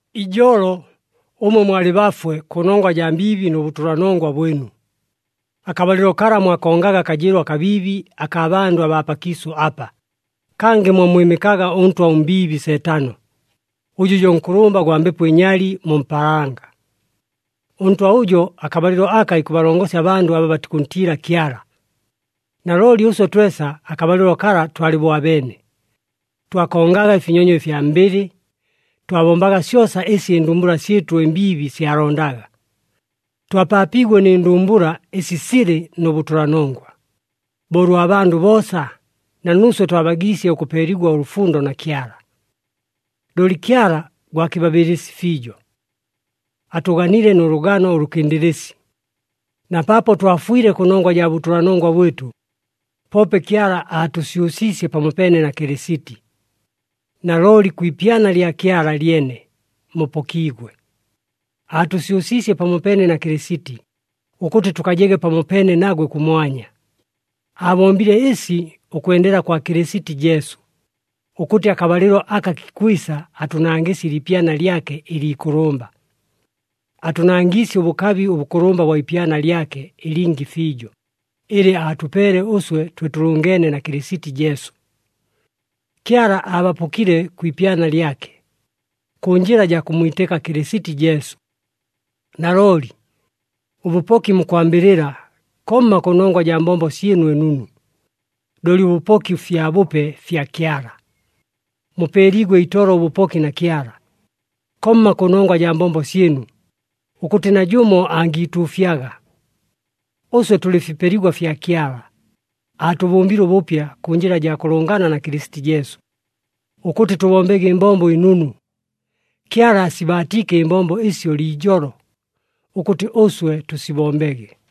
Ijolo, ʉmwe mwalɨ bafwe, kʉnongwa jaa mbiibi nʉ bʉtʉlanongwa bwɨnu. Akabalɨlo kala mwakongaga akajɨɨlo akabiibi akaa bandʉ abaa pakiisʉ apa, kangɨ mwammwɨmɨkaga ʉntwa ʉmbiibi Seetano, ʉjʉ jo nkʉlʉmba gwa mbepo ɨnyali mu mpaalanga. Ʉntwa ʉjo akabalɨlo aka ikʉbalongosya abandʉ aba batikʉntiila Kyala. Nalooli ʉswe twesa akabalɨlo kala twalɨ bo abeene. Twakongaga ɨfinyonyo ɨfya mbɨlɨ. Twabombaga syosa ɨsi ɨndumbula syɨtʉ ɨmbiibi syalondaga. Twapaapiigwe nɨ ndumbula ɨsi silɨ nʉ bʉtʉlanongwa. Bo ʉlwa bandʉ boosa, na nuuswe twabagiisye ʉkʉpeeligwa ʉlʉfundo na Kyala. Looli Kyala gwa kɨbabɨɨlɨsi fiijo. Atʉganile nʉ lʉgano ʉlʉkɨndɨlɨsi. Na paapo twafwile kʉnongwa jaa bʉtʉlanongwa bwɨtʉ, poope Kyala aatʉsyʉsiisye pamopeene na Kɨlɨsiti. Nalooli kwi ipyana lya Kyala lyene, mupokiigwe. Aatʉsyʉsiisye pamopeene na Kɨlɨsiti, ʉkʉtɨ tʉkajege pamopeene nagwe kʉmwanya. Aabombile ɨsi ʉkwendela kwa Kɨlɨsiti Jesu, ʉkʉtɨ akabalɨlo aka kikwisa atʉnangɨsye ɨliipyana lyake ɨliikʉlʉmba. Atʉnangiisye ʉbʉkabi ʉbʉkʉlʉmba bwa ipyana lyake ɨlingi fiijo, ɨlɨ atʉpeele ʉswe twe tʉlʉngeene na Kɨlɨsiti Jesu. Kyala abapokile kwi ipyana lyake, kʉ njɨla jaa kʉmmwitɨka Kɨlɨsiti Jesu. Nalooli, ʉbʉpoki mukwambɨlɨla, komma kʉnongwa jaa mbombo syɨnu ɨnunu, looli ʉbʉpoki fyabʉpe fya Kyala. Mupeeliigwe itolo ʉbʉpoki na Kyala, komma kʉnongwa jaa mbombo syɨnu, ʉkʉtɨ najʉmo angiituufyaga. Ʉswe tʉlɨ fipeligwa fya Kyala, aatʉbʉmbile ʉbʉpya kʉ njɨla jaa kʉlʉngana na Kɨlɨsiti Jesu, ʉkʉtɨ tʉbombege ɨmbombo ɨnunu. Kyala aasibaatiike ɨmbombo ɨsyo liijolo, ʉkʉtɨ ʉswe tʉsibombege.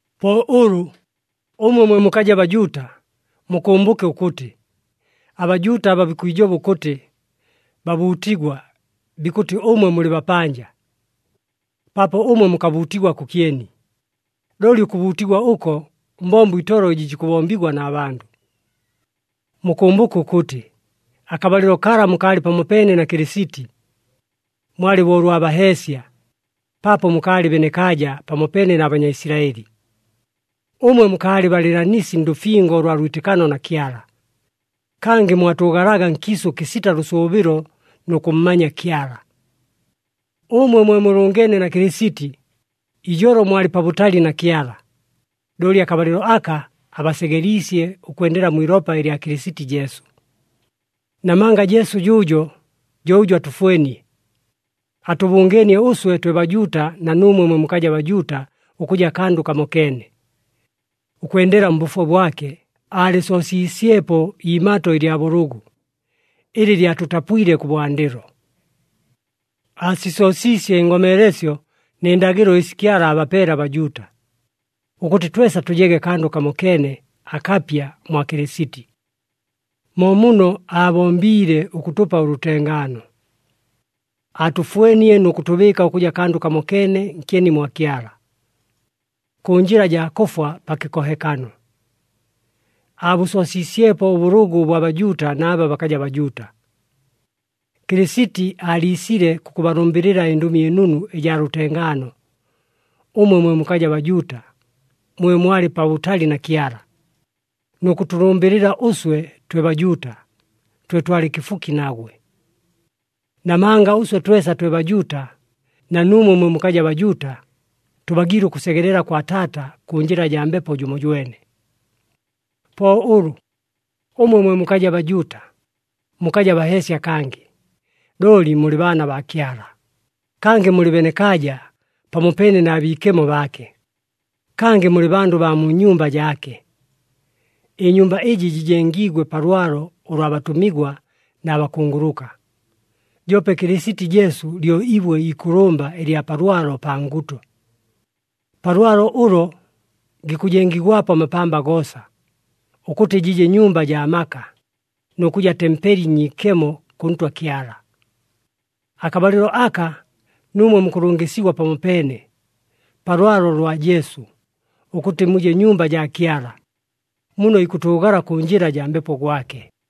Po ʉlʉ, ʉmwe mwe mukaja Bajuuta, mukʉmbʉke ʉkʉtɨ, aBajuuta aba bikwijoba ʉkʉtɨ, “Babuutigwa,” bikʉtɨ ʉmwe mulɨ, “Bapanja,” paapo ʉmwe mukabuutigwa kʉkyeni. Looli ʉkʉbuutigwa ʉko mbombo itolo ɨjɨ jikʉbombigwa na bandʉ. Mukʉmbʉke ʉkʉtɨ, akabalɨlo kala mukaalɨ pamopeene na Kɨlɨsiti. Mwalɨ bo ʉlwa baheesya, paapo mukaalɨ benekaaja pamopeene na Banyaisilaɨli. Ʉmwe mukaalɨ balɨɨlanisi ndʉfingo ʉlwa lwitɨkano na Kyala. Kangɨ mwatʉʉgalaga nkiisʉ kɨsita lʉsʉʉbɨlo nʉ kʉmmanya Kyala. Ʉmwe mwe mulʉngeene na Kɨlɨsiti, ijolo mwalɨ pabʉtali na Kyala, looli akabalɨlo aka abasegeliisye ʉkwendela mwi ilopa lya Kɨlɨsiti Jesu. Namanga Jesu jʉʉjo, jo ʉjʉ atʉfwenie. Atʉbʉngeenie ʉswe twe Bajuuta na nuumwe mwe mukaja Bajuuta ʉkʉja kandʉ kamokeene. Ʉkwendela mbʉfwe bwake, aalɨsoosiisyepo iimato ɨlya bʉlʉgʉ, ɨlɨ lyatʉtapwile kʉbwandɨlo. Aasisoosiisye ɨngomeelesyo nɨ ndagɨlo ɨsi Kyala aabapeele aBajuuta, ʉkʉtɨ twesa tʉjege kandʉ kamokeene akapya mwa Kɨlɨsiti. Mo muno aabombiile ʉkʉtʉpa ʉlʉtengaano. Aatʉfwenie nʉ kʉtʉbɨɨka ʉkʉja kandʉ kamokeene nkyeni mwa Kyala. Kʉ njɨla jaa kʉfwa pa kɨkohekano, aabʉsoosiisyepo ʉbʉlʉgʉ ʉbwa Bajuuta na aba bakaja Bajuuta. Kɨlɨsiti aaliisile kʉkʉbalʉmbɨlɨla ɨNdʉmi ɨNunu ɨjaa lʉtengaano, ʉmwe mwe mukaja Bajuuta, mwe mwalɨ pabʉtali na Kyala, nʉ kʉtʉlʉmbɨlɨla ʉswe twe Bajuuta, twe twalɨ kɨfuki nagwe. Namanga ʉswe twesa twe Bajuuta, na nuumwe mwe mukaja Bajuuta, tʉbagiile ʉkʉsegelela kwa Taata kʉ njɨla jaa Mbepo jʉmojwene. Po ʉlʉ, ʉmwe mwe mukaja Bajuuta, mukaja baheesya kangɨ. Looli mulɨ baana baa Kyala, kangɨ mulɨ benekaaja pamopeene na biikemo baake, kangɨ mulɨ bandʉ baa mu nyumba jaake. Ɨnyumba ɨjɨ jɨjengiigwe pa lwalo ʉlwa batʉmigwa na bakunguluka, joope Kɨlɨsiti Jesu lyo ibwe iikʉlʉmba ɨlya pa lwalo pa nguto. Pa lwalo ʉlo, gikʉjengigwapo amapamba goosa, ʉkʉtɨ jɨje nyumba jaa maka, nʉ kʉja tempeli nyiikemo kʉ Ntwa Kyala. Akabalɨlo aka, nuumwe mukʉlʉngɨsigwa pamopeene, pa lwalo lwa Jesu, ʉkʉtɨ muje nyumba jaa Kyala, muno ikʉtʉʉgala kʉ njɨla jaa Mbepo gwake.